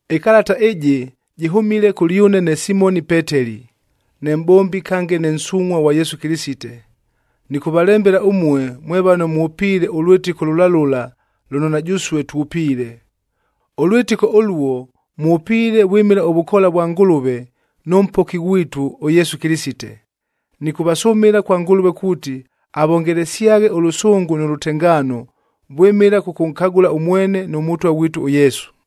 Ɨkalata ɨjɨ jɨhʉmile kʉlyʉne ne Simoni Peteli, ne mʼbombi kange ne nsungʼhua ghwa Yesu Kɨlɨsite. Nɨkʉvalembela ʉmue mwe vano mwʉpiile ʉlwɨtɨko lʉla lʉla lʉno na jʉsue twʉpiile. Ʉlwɨtɨko ʉluo mwʉpiile vwɨmɨla ʉvʉkoola vwa Ngʉlʉve nʉ Mpoki ghwitu, ʉYesu Kɨlɨsite. Nɨkʉvasʉmɨla kwa Ngʉlʉve kuuti avongelesyaghe ʉlʉsʉngʉ nʉ lʉtengaano, vwɨmɨla kʉkʉnkagʉla ʉmwene nʉ Mʉtwa ghwitu ʉYesu.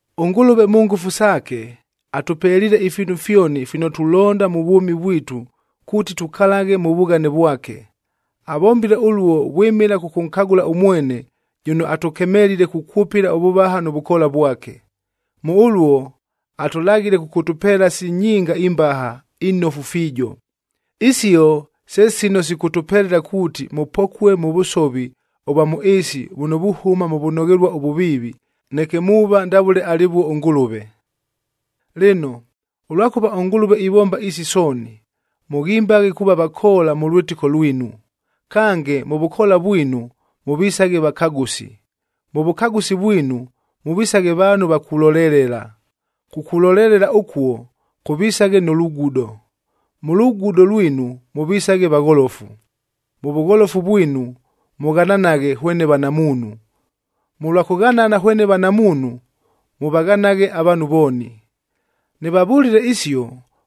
ɄNgʉlʉve mʉ ngʉfu saake, atʉpeliile ifiinu fyoni fino tulonda mʉ vwʉmi vwitu kuuti tukalaghe mʉ vughane vwake. Avombile ʉluo vwɨmɨla kʉkʉnkagʉla ʉmwene jʉno atʉkemelile kukwʉpɨla ʉvʉvaha nʉ vʉkoola vwake. Mʉ ʉluo, atʉlaghile kʉkʉtʉpeela si nyinga imbaha, inofu fiijo. Isio se sino sikʉtʉpelela kuuti mʉpokue mʉ vʉsovi ʉvwa mʉ ɨɨsi vʉno vuhʉma mʉ vʉnoghelua ʉvʉviivi, neke muuva ndavʉle alɨvuo ʉNgʉlʉve. Lɨno, ʉlwakʉva ʉNgʉlʉve ivomba isi sooni, mʉghimbaghe kuuva vakoola mʉ lwɨtɨko lwinu; kange mʉ vʉkoola vwinu, mʉvisaghe vakagʉsi. Mʉ vʉkagʉsi vwinu, mʉvisaghe vaanhu va kulolelela; kukulolelela ʉkuo, kʉvisaghe nʉ lugudo; mʉ lugudo lwinu, mʉvisaghe vagholofu; mʉ vʉgholofu vwinu, mʉghananaghe hwene vanamuunhu; mʉlwa kʉghanana hwene vanamuunhu, mʉvaghanaghe avaanhu vooni. Nɨvavʉlile isio,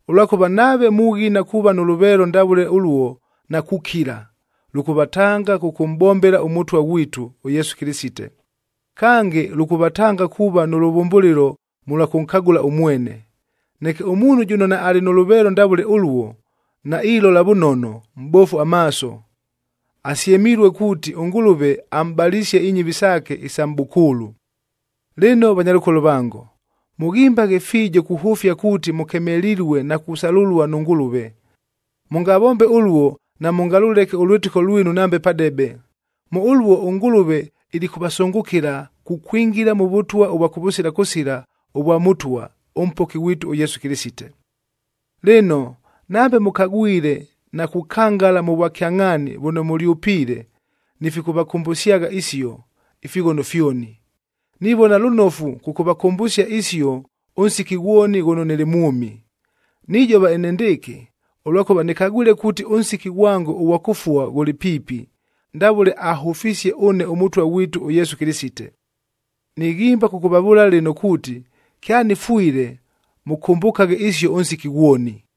ʉlwakʉva nave mughina kuuva nʉ lʉveelo ndavʉle ʉluo na kukila, lʉkʉvatanga kʉkʉmʼbombela ʉMʉtwa ghwitu, ʉYesu Kɨlɨsite. Kange, lʉkʉvatanga kuuva nʉ lʉvʉmbʉlɨlo mʉlwa kʉnkagʉla ʉmwene. Neke ʉmuunhu jʉno naalɨ nʉ lʉveelo ndavʉle ʉluo, nailola vʉnono, mʼbofu amaaso, asyemilue kuuti ʉNgʉlʉve amʼbalisie inyɨvi saake isa mʼbʉkʉʉlʉ. Lɨno vanyalʉkolo vango, mʉghimbaghe fiijo kuhʉfia kuuti mʉkemelilue na kusalʉlua nʉ Ngʉlʉve. Mʉngavombe ʉluo, namʉngalʉleke ʉlwɨtɨko lwinu nambe padebe. Mʉ ʉluo ʉNgʉlʉve ilikʉvasʉngʉkɨla kukwingila mʉ Vʉtwa ʉvwa kʉvʉsila kʉsila ʉvwa Mʉtwa, ʉMpoki ghwitu ʉYesu Kɨlɨsite. Lɨno, nambe mʉkagwile na kukangala mʉ vwakyangʼhaani vʉno mʉlyʉpiile, nifikʉvakʉmbʉsyagha isio, ifighono fyoni. Nivona lʉnofu kʉkʉvakʉmbʉsia isio ʉnsiki ghwoni ghʉno nɨlɨ mwʉmi. Nijova enendɨɨkɨ, ʉlwakʉva nɨkagwile kuuti ʉnsiki ghwango ʉghwa kʉfua ghʉlɨ piipi, ndavʉle ahʉfisie ʉne ʉMʉtwa ghwitu ʉYesu Kɨlɨsite. Nighimba kʉkʉvavʉʉla lɨno kuuti, kyanɨfwile mʉkʉmbʉkaghe isio ʉnsiki ghwoni.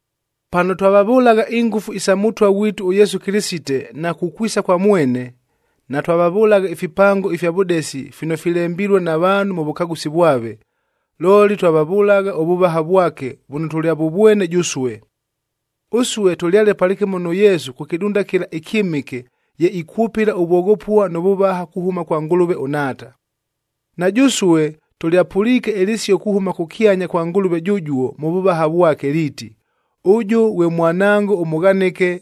Pano twavavʉlagha ingʉfu isa Mʉtwa ghwitu ʉYesu Kɨlɨsite na kukwisa kwa mwene, natwavavʉlagha ifipango ifya vʉdesi fino filembilue na vaanhu mʉ vʉkagʉsi vwave, looli twavavʉlagha ʉvʉvaha vwake vʉno tʉlyavʉvwene jʉsue. Ʉsue tʉlyale palɨkɨmo nʉ Yesu kʉ kɨdunda kɨla ɨkyɨmɨke ye ikwʉpɨla ʉvwoghopua nʉ vʉvaha kuhʉma kwa Ngʉlʉve ʉNhaata. Na jʉsue tʉlyapʉliike ɨlɨsio kuhʉma kʉkyanya kwa Ngʉlʉve jʉjuo mʉ vʉvaha vwake liiti, “Ʉjʉ ghwe Mwanangoa ʉmʉghanɨke,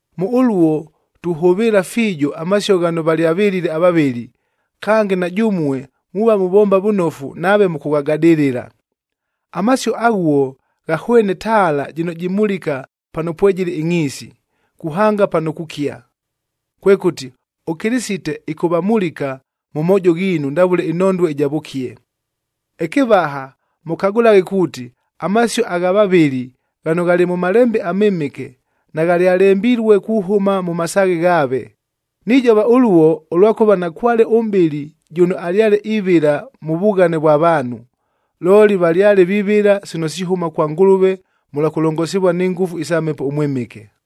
Mʉ ʉluo tuhʉvɨɨla fiijo amasio ghano valyavɨlile avavɨli, kange na jʉmue muuva muvomba vʉnofu nave mʉkʉghagadɨlɨla. Amasio aghuo ghahwene taala jɨno jimulika pano pwejɨlɨ ɨngʼhiisi, kuhanga pano kukia. Kwekʉti, ʉKɨlɨsite ɨkʉvamulika mʉ moojo ghiinu ndavʉle ɨnhondue ɨja vʉkie. Ɨkɨvaha, mʉkagʉlaghe kuuti amasio agha vavɨli ghano ghalɨ mʉ Malembe aMɨmɨke, naghalyalembilue kuhʉma mʉ masaaghe ghaave. Nijova ʉluo, ʉlwakʉva nakwale ʉmʼbɨli jʉno alyale ivɨla mʉ vughane vwa vaanhu, looli valyale vivɨla sino sihʉma kwa Ngʉlʉve mʉlwa kʉlongosivua ni ngʉfu isa Mhepo ʉMwɨmɨke.